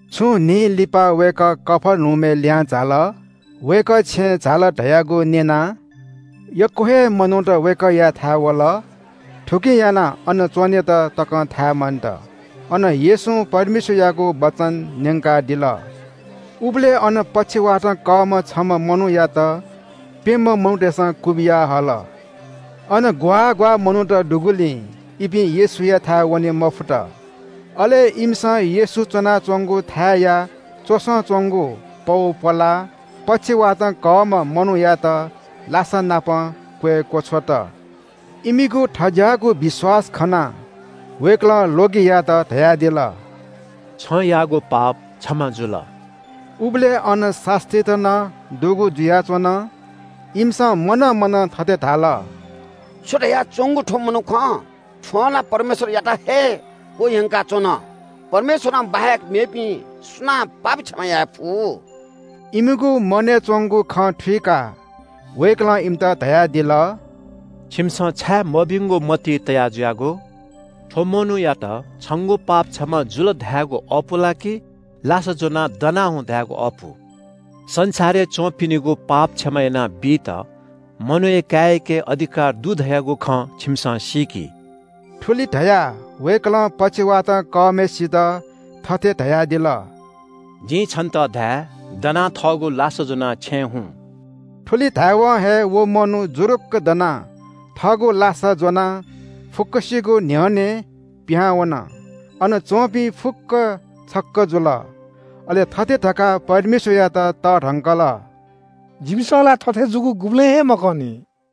छुं दिं लिपा वय्‌कः कफर्नहुमय् लिहां झाल। वय्‌कः छेँय् झाल धयागु न्‍यनाः यक्‍व हे मनूत वय्‌कःयाथाय् वल। थुकिं यानाः अन लुखाया पिने तक नं च्‍वनेत थाय् मन्‍त। अन येशूं परमेश्‍वरयागु वचन न्‍यंकादिल। उबलय् अन पक्षवातं कःम्‍ह छम्‍ह मनूयात प्‍यम्‍ह मनूतय्‌सं क्‍वबिया हल। अन ग्‍वाः ग्‍वाः मनूत दुगुलिं इपिं येशूयाथाय् वने मफुत। अले इमिसं येशू च्‍वनाच्‍वंगु थाय्‌या च्‍वसं च्‍वंगु पौ प्‍वलाः पक्षवातं कःम्‍ह मनूयात लासानापं क्‍वय् क्‍वछ्वत। इमिगु थज्‍याःगु विश्‍वास खनाः वय्‌कलं ल्‍वगियात धयादिल – “छं याःगु पाप क्षमा जुल।” उबलय् अन शास्‍त्रीत नं दुगु जुयाच्‍वन। इमिसं मनं मनं थथे धाल – “छु धयाच्‍वंगु थ्‍व मनुखं? थ्‍वं ला परमेश्‍वरयात हे क्‍वह्यंकाच्‍वन। परमेश्‍वरं बाहेक मेपिं सुनां पाप क्षमा याये फु?” इमिगु मनय् च्‍वंगु खँ थत्‍थें थःगु आत्‍माय्‌ थुइकाः वय्‌कलं इमित धयादिल – “छिमिसं छाय् मभिंगु मतिइ तया जुयागु? थ्‍व मनूयात ‘छंगु पाप क्षमा जुल’ धायेगु अःपु ला कि ‘लासा ज्‍वनाः दना हुँ’ धायेगु अःपु? संसारय् च्‍वंपिनिगु पाप क्षमा यानाबीत मनूया काय्‌याके अधिकार दु धयागु खँ छिमिसं सीकि।” थुलि धयाः वय्‌कलं पक्षवातं कःम्‍हय्‌सित थथे धयादिल – “जिं छन्‍त धाये – दनाः थःगु लासा ज्‍वनाः छेँ हुँ।” थुलि धायेवं हे व मनू जुरुक्‍क दनाः थःगु लासा ज्‍वनाः फुक्‍कसिगु न्‍ह्यःनें पिहां वन। अन च्‍वंपिं फुक्‍कं छक्‍क जुल। अले थथे धकाः परमेश्‍वरयात तःधंकल – “जिमिसं ला थथे जूगु गुबलें हे मखंनि।”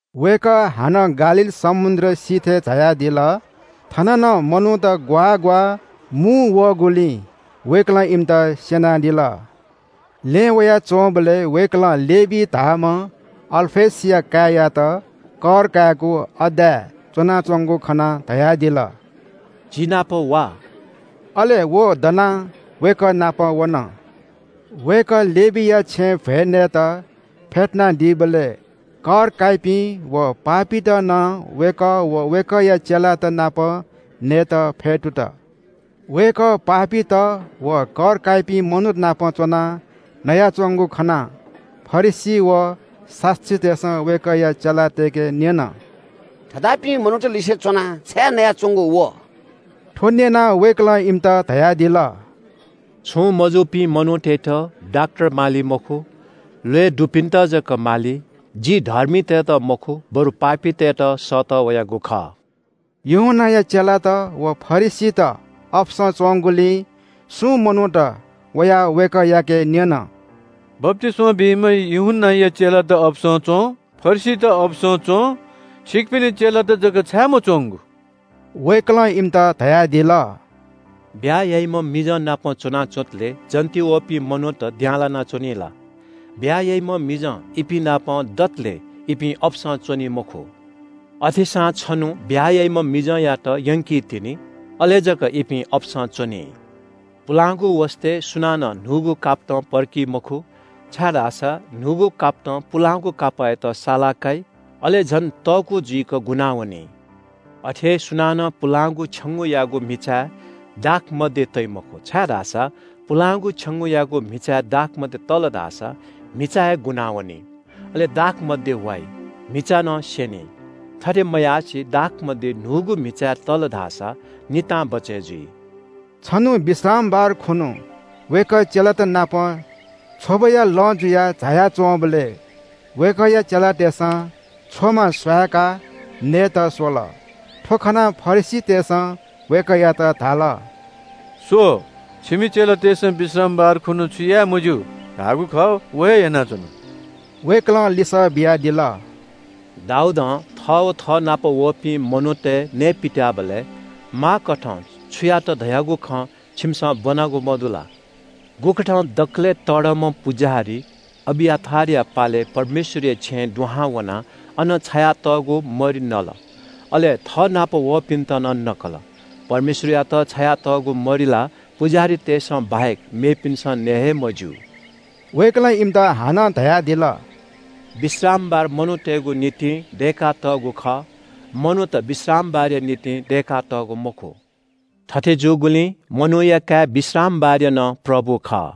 वय्‌कः हानं गालील समुद्र सिथय् झायादिल। थन नं मनूत ग्‍वाः ग्‍वाः मुंवःगुलिं वय्‌कलं इमित स्‍यनादिल। लँय् वयाच्‍वंबलय् वय्‌कलं लेवी धाःम्‍ह अल्‍फयसया काय्‌यात कर कायेगु अड्डाय् च्‍वनाच्‍वंगु खनाः धयादिल – “जि नाप वा।” अले व दनाः वय्‌कः नाप वन। वय्‌कः लेवीया छेँय् भ्‍वय् नयेत फेतुनादीबलय् कर काइपिं व पापीत नं वय्‌कः व वय्‌कःया चेलात नाप नयेत फ्‍यतुत। वय्‌कः पापीत व कर काइपिं मनूत नाप च्‍वनाः नयाच्‍वंगु खनाः फरिसी व शास्‍त्रीतय्‌सं वय्‌कःया चेलातय्‌के न्‍यन – “थज्‍याःपिं मनूतलिसे च्‍वनाः छाय् नयाच्‍वंगु व?” थ्‍व न्‍यनाः वय्‌कलं इमित धयादिल – “छुं मजूपिं मनूतय्‌त डाक्‍टर माली मखु, ल्‍वय् दुपिन्‍त जक माली। जि धर्मीतय्‌त मखु बरु पापीतय्‌त सःतः वयागु खः।” यूहन्‍नाया चेलात व फरिसीत अपसं च्‍वंगुलिं सुं मनूत वयाः वय्‌कःयाके न्‍यन – “बप्‍तिस्‍मा बीम्‍ह यूहन्‍नाया चेलात अपसं च्‍वं, फरिसीत अपसं च्‍वं, छिकपिनि चेलात जक छाय् मच्‍वंगु?” वय्‌कलं इमित धयादिल – “ब्‍याहा याइम्‍ह मिजंनापं च्‍वनाच्‍वंतले जन्‍त वःपिं मनूत द्यां लानाच्‍वनी ला? ब्‍याहा याइम्‍ह मिजं इपिंनापं दतले इपिं अपसं च्‍वनी मखु। अथेसां छन्‍हु ब्‍याहा याइम्‍ह मिजंयात यंकितिनि। अले जक इपिं अपसं च्‍वनी।” “पुलांगु वसतय् सुनानं न्‍हूगु कापतं पर्की मखु, छाय्‌धाःसा न्‍हूगु कापतं पुलांगु कापःयात साला काइ, अले झन तःकू जुइक गुनावनी। “अथे हे सुनानं पुलांगु छेंगूयागु म्‍हिचाय् दाखमद्य तइ मखु, छाय्‌धाःसा पुलांगु छेंगूयागु म्‍हिचाय् दाखमद्य तल धाःसा म्‍हिचा हे गुनावनी, अले दाखमद्य वाइ, म्‍हिचा नं स्‍यनी। थथे मयासें दाखमद्य न्‍हूगु म्‍हिचाय् तल धाःसा नितां बचय् जुइ।” छन्‍हु विश्रामबार खुन्‍हु वय्‌कः चेलात नाप छ्वबया लँ जुयाः झाया च्‍वंबलय् वय्‌कःया चेलातय्‌सं छ्वमा स्‍वहाय्‌काः नयेत स्‍वल। थ्‍व खनाः फरिसीतय्‌सं वय्‌कःयात धाल – “स्‍व, छिमि चेलातय्‌सं विश्रामबार खुन्‍हु छु याये मज्‍यू धाःगु खः व हे यानाच्‍वन।” वय्‌कलं लिसः बियादिल – “दाऊदं थः व थःनाप वःपिं मनूतय् नये पित्‍याःबलय् माःकथं छु यात धयागु खँ छिमिसं ब्‍वनागु मदु ला? गुकथं दकलय् तःधंम्‍ह पुजाहारी अबियाथारया पालय् परमेश्‍वरया छेँय् दुहां वनाः अन छायातःगु मरि नल, अले थःनाप वःपिन्‍त नं नकल। परमेश्‍वरयात छायातःगु मरि ला पुजाहारीतय्‌सं बाहेक मेपिन्‍सं नये हे मज्‍यू।” वय्‌कलं इमित हानं धयादिल – “विश्रामबार मनूतय्‌गु निंतिं दय्‌कातःगु खः, मनूत विश्रामबारया निंतिं दय्‌कातःगु मखु। थथे जूगुलिं मनूया काय् विश्रामबारया नं प्रभु खः।”